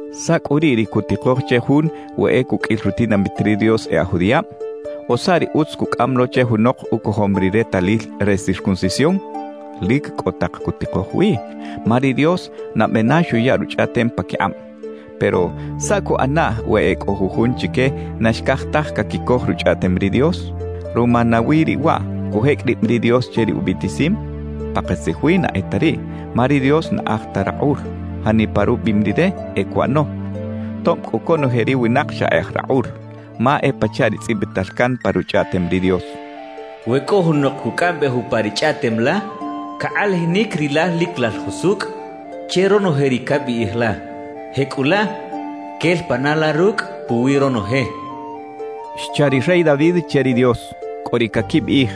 ¿Saꞌ cꞌu riꞌ ri cutikoj che jun we e cuqꞌuil rutinamit ri Dios e aj judiꞌab? ¿O saꞌ ri utz cucꞌam lo che junok ucojom ri retalil re circuncisión? Lic cꞌo tak cutikoj wi. Ma ri Dios nabe na xuya Ruchꞌaꞌtem paquikꞌab. Pero ¿saꞌ cuꞌanaꞌ we e cꞌo jujun chique na xcaj taj caquicoj Ruchꞌaꞌtem ri Dios? ¿Ruma nawi riꞌ waꞌ cujecꞌ rib ri Dios che ri ubiꞌtisim? ¡Pakatzij wi na e ta riꞌ! Ma ri Dios na aj ta rakꞌul; janipa rubiꞌim Rire, e cuꞌano, tob cꞌu conoje ri winak xa e aj rakꞌul. Ma e pachaꞌ ri tzꞌibital can pa Ruchꞌaꞌtem ri Dios: We cꞌo junok cucꞌambej upa ri chꞌaꞌtem la, cakꞌalajinic Rilal lic Lal jusucꞌ che ronoje ri cabiꞌij la; jecꞌulaꞌ quel pana la rucꞌ puwi ronoje xcha ri rey David che ri Dios. Cꞌo ri caquibiꞌij: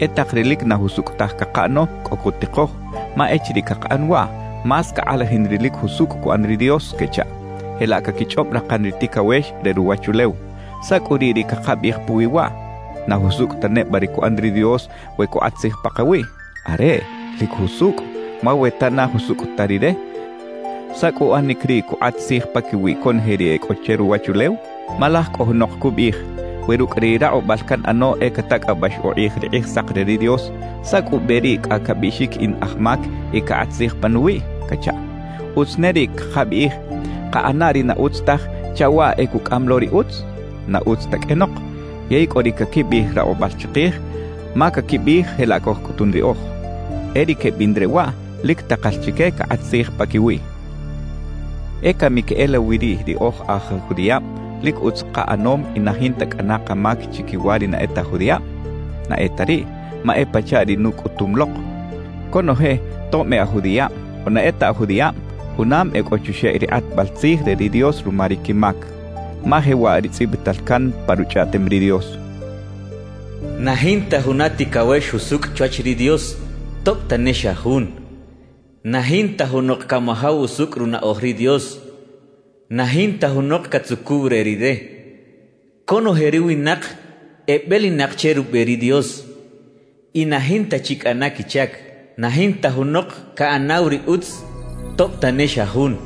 «E tak ri lic na jusucꞌ taj cakaꞌano cꞌo cutikoj; ma echiriꞌ cakaꞌan waꞌ, más cakꞌalajin ri lic jusucꞌ cuꞌan ri Dios» quechaꞌ. (Jelaꞌ caquichꞌob rakan ri ticawex re ruwachulew.) ¿Saꞌ cꞌu riꞌ ri cakabiꞌij puwi waꞌ? ¿Na jusucꞌ ta neba ri cuꞌan ri Dios we cukꞌat tzij pakawiꞌ? ¡Areꞌ, lic jusucꞌ! Ma we ta na jusucꞌ ta Rire, ¿saꞌ cꞌu uꞌanic riꞌ cukꞌat tzij paquiwi conoje ri e cꞌo che ruwachulew? Ma laj cꞌo junok cubiꞌij: «We rucꞌ ri rakꞌubal canꞌano e catacꞌabax ukꞌij ri Kꞌijsak re ri Dios, ¿saꞌ cꞌu ube riꞌ cꞌa cabiꞌxic in aj mac y cakꞌat tzij panuwiꞌ?» cachaꞌ. ¿Utz ne riꞌ cakabiꞌij: «Kaꞌana ri na utz taj chaꞌ waꞌ e cucꞌam lo ri utz»? ¡Na utz ta qꞌuenok! Yey cꞌo ri caquibiꞌij rakꞌubal chikij, ma caquibiꞌij jelaꞌ cojcꞌutun riꞌoj. E ri quebiꞌn re waꞌ, lic takal chique cakꞌat tzij paquiwiꞌ. ¿E cami queꞌelawi riꞌ ri oj aj judiꞌab, lic utz kaꞌanom y na jinta cꞌana kamac chiquiwa ri na e ta aj judiꞌab? ¡Na e ta riꞌ! Ma e pachaꞌ ri nucꞌutum lok: Conoje, tob e aj judiꞌab o na e ta aj judiꞌab, junam e cꞌo chuxeꞌ ri kꞌatbal tzij re ri Dios ruma ri quimac. Ma jewaꞌ ri tzꞌibital can pa Ruchꞌaꞌtem ri Dios: Na jinta juna ticawex jusucꞌ chwach ri Dios, tob tane xa jun. Na jinta junok camajaw usucꞌ runaꞌoj ri Dios. Na jinta junok catzucuw re Rire. Conoje ri winak ebelinak che rube ri Dios, y na jinta chi cꞌana quichac. Na jinta junok caꞌanaw ri utz, tob tane xa jun.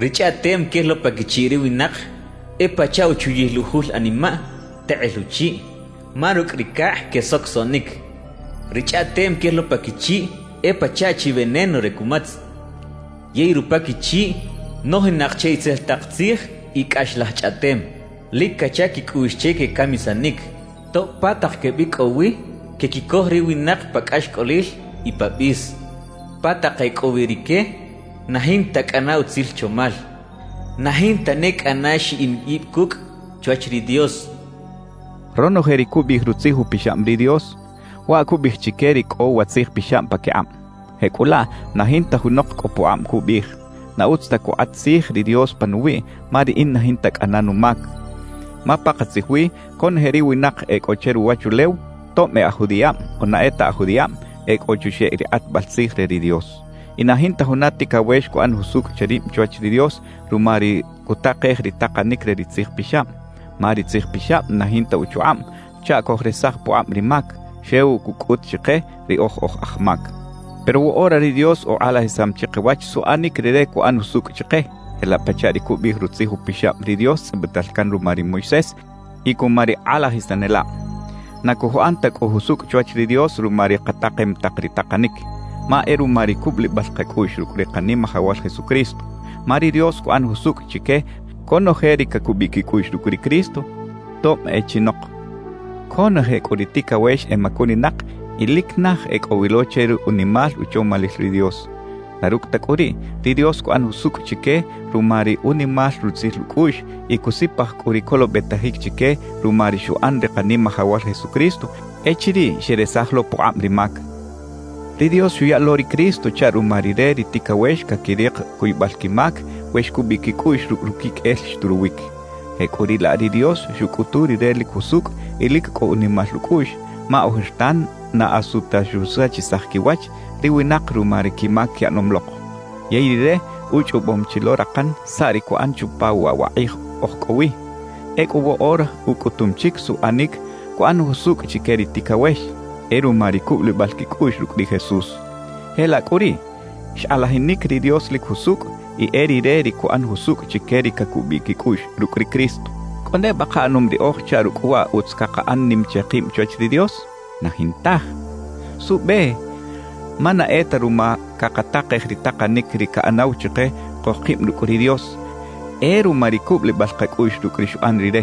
Ri chꞌaꞌtem quel lo pa quichiꞌ ri winak e pachaꞌ uchuyil ujul animaꞌ tekꞌel uchiꞌ; ma rucꞌ ri cakꞌ quesocosoꞌnic. Ri chꞌaꞌtem quel lo pa quichiꞌ e pachaꞌ chi veneno re cumatz. Yey rupa quichiꞌ nojinak che itzel tak tzij y cꞌaxlaj chꞌaꞌtem. Lic cacha quicꞌuꞌx che quecamisanic. Tob pa tak quebicꞌow wi, quequicoj ri winak pa cꞌaxcꞌolil y pa bis; pa tak e cꞌo wi rique, na jinta cꞌana utzil chomal. Na jinta ne cꞌana xiꞌin ib cucꞌ chwach ri Dios cachaꞌ. Ronoje ri cubiꞌij Rutzij Upixab ri Dios, waꞌ cubiꞌij chique ri cꞌo wa Tzij Pixab paquikꞌab. Jecꞌulaꞌ na jinta junok cꞌo pukꞌab cubiꞌij: «Na utz ta cukꞌat tzij ri Dios panuwiꞌ ma riꞌin na jinta cꞌana numac.» Ma pakatzij wi conoje ri winak e cꞌo che ruwachulew, tob e aj judiꞌab o na e ta aj judiꞌab, e cꞌo chuxeꞌ ri kꞌatbal tzij re ri Dios. Y na jinta juna ticawex cuꞌan jusucꞌ che rib chwach ri Dios ruma ri cutakej ri takanic re ri Tzij Pixab. Ma ri Tzij Pixab na jinta uchukꞌab chaꞌ cojresaj pukꞌab ri mac; xew cucꞌut chike: Riꞌoj oj aj mac. Pero woꞌora ri Dios ukꞌalajisam chikawach suꞌanic Rire cuꞌan jusucꞌ chike, jelaꞌ pachaꞌ ri cubiꞌij Rutzij Upixab ri Dios tzꞌibital can ruma ri Moisés y cuma ri kꞌalajisanelab. Na cojuꞌan ta cꞌu jusucꞌ chwach ri Dios ruma ri katakem tak ri takanic, ma e ruma ri cubulibal kacꞌuꞌx rucꞌ ri Kanimajawal Jesucristo. Ma ri Dios cuꞌan jusucꞌ chique conoje ri cacubiꞌ quicꞌuꞌx rucꞌ ri Cristo, tob e chinok. Conoje cꞌu ri ticawex emacuninak y lic naj e cꞌo wi lo che ri unimal uchomalil ri Dios. Na rucꞌ ta cꞌu riꞌ, ri Dios cuꞌan jusucꞌ chique ruma ri unimal rutzil ucꞌuꞌx y cusipaj cꞌu ri colobetajic chique ruma ri xuꞌan ri Kanimajawal Jesucristo echiriꞌ xeresaj lo pukꞌab ri mac. Ri Dios xuya lo ri Cristo chaꞌ ruma Rire ri ticawex caquirik cuybal quimac we xcubiꞌ quicꞌuꞌx rucꞌ ruquiqꞌuel xturuwic. Jecꞌuriꞌlaꞌ ri Dios xucꞌutu Rire lic jusucꞌ y lic cꞌo unimal ucꞌuꞌx, ma ojertan na asu ta xusachisaj quiwach ri winak ruma ri quimac quiꞌanom lok. Yey Rire uchꞌobom chi lo rakan saꞌ ri cuꞌan chupa waꞌ wa kꞌij oj cꞌo wi. Ecꞌu woꞌora ucꞌutum chic suꞌanic cuꞌan jusucꞌ chique ri ticawex; e ruma ri cubulibal quicꞌuꞌx rucꞌ ri Jesús. Jelaꞌ cꞌu riꞌ, xkꞌalajinic ri Dios lic jusucꞌ y e Rire ri cuꞌan jusucꞌ chique ri cacubiꞌ quicꞌuꞌx rucꞌ ri Cristo. ¿Cꞌo neba kaꞌanom riꞌoj chaꞌ rucꞌ waꞌ utz cakaꞌan nim che kib chwach ri Dios? ¡Na jintaj! ¿Suꞌbe? Ma na e ta ruma cakatakej ri takanic ri caꞌanaw chike cojkib rucꞌ ri Dios; e ruma ri cubulibal kacꞌuꞌx rucꞌ ri xuꞌan Rire.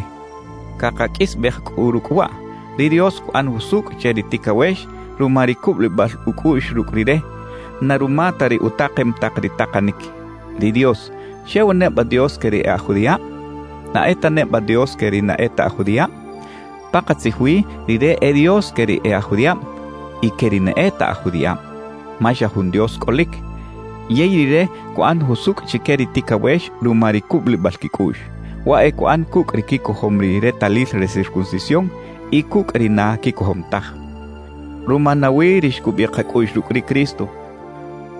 Cakaqꞌuisbej cꞌu rucꞌ waꞌ: Ri Dios cuꞌan jusucꞌ che ri ticawex ruma ri cubulibal ucꞌuꞌx rucꞌ Rire, na ruma ta ri utakem tak ri takanic. ¿Ri Dios xew neba Dios que ri e aj judiꞌab? ¿Na e ta neba Dios que ri na e ta aj judiꞌab? Pakatzij wi Rire e Dios que ri e aj judiꞌab y que ri na e ta aj judiꞌab. Ma xa jun Dios cꞌolic. Yey Rire cuꞌan jusucꞌ chique ri ticawex ruma ri cubulibal quicꞌuꞌx. Waꞌ e cuꞌan cucꞌ ri quicojom ri retalil re circuncisión y cucꞌ ri na quicojom taj. ¿Ruma nawi ri xcubiꞌ kacꞌuꞌx rucꞌ ri Cristo,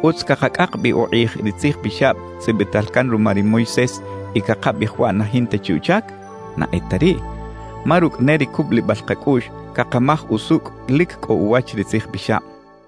utz cakacꞌak bi ukꞌij ri Tzij Pixab tzꞌibital can ruma ri Moisés y cakabiꞌij waꞌ na jinta chi uchac? ¡Na e ta riꞌ! Ma rucꞌ ne ri cubulibal kacꞌuꞌx, cakamaj usucꞌ lic cꞌo uwach ri Tzij Pixab.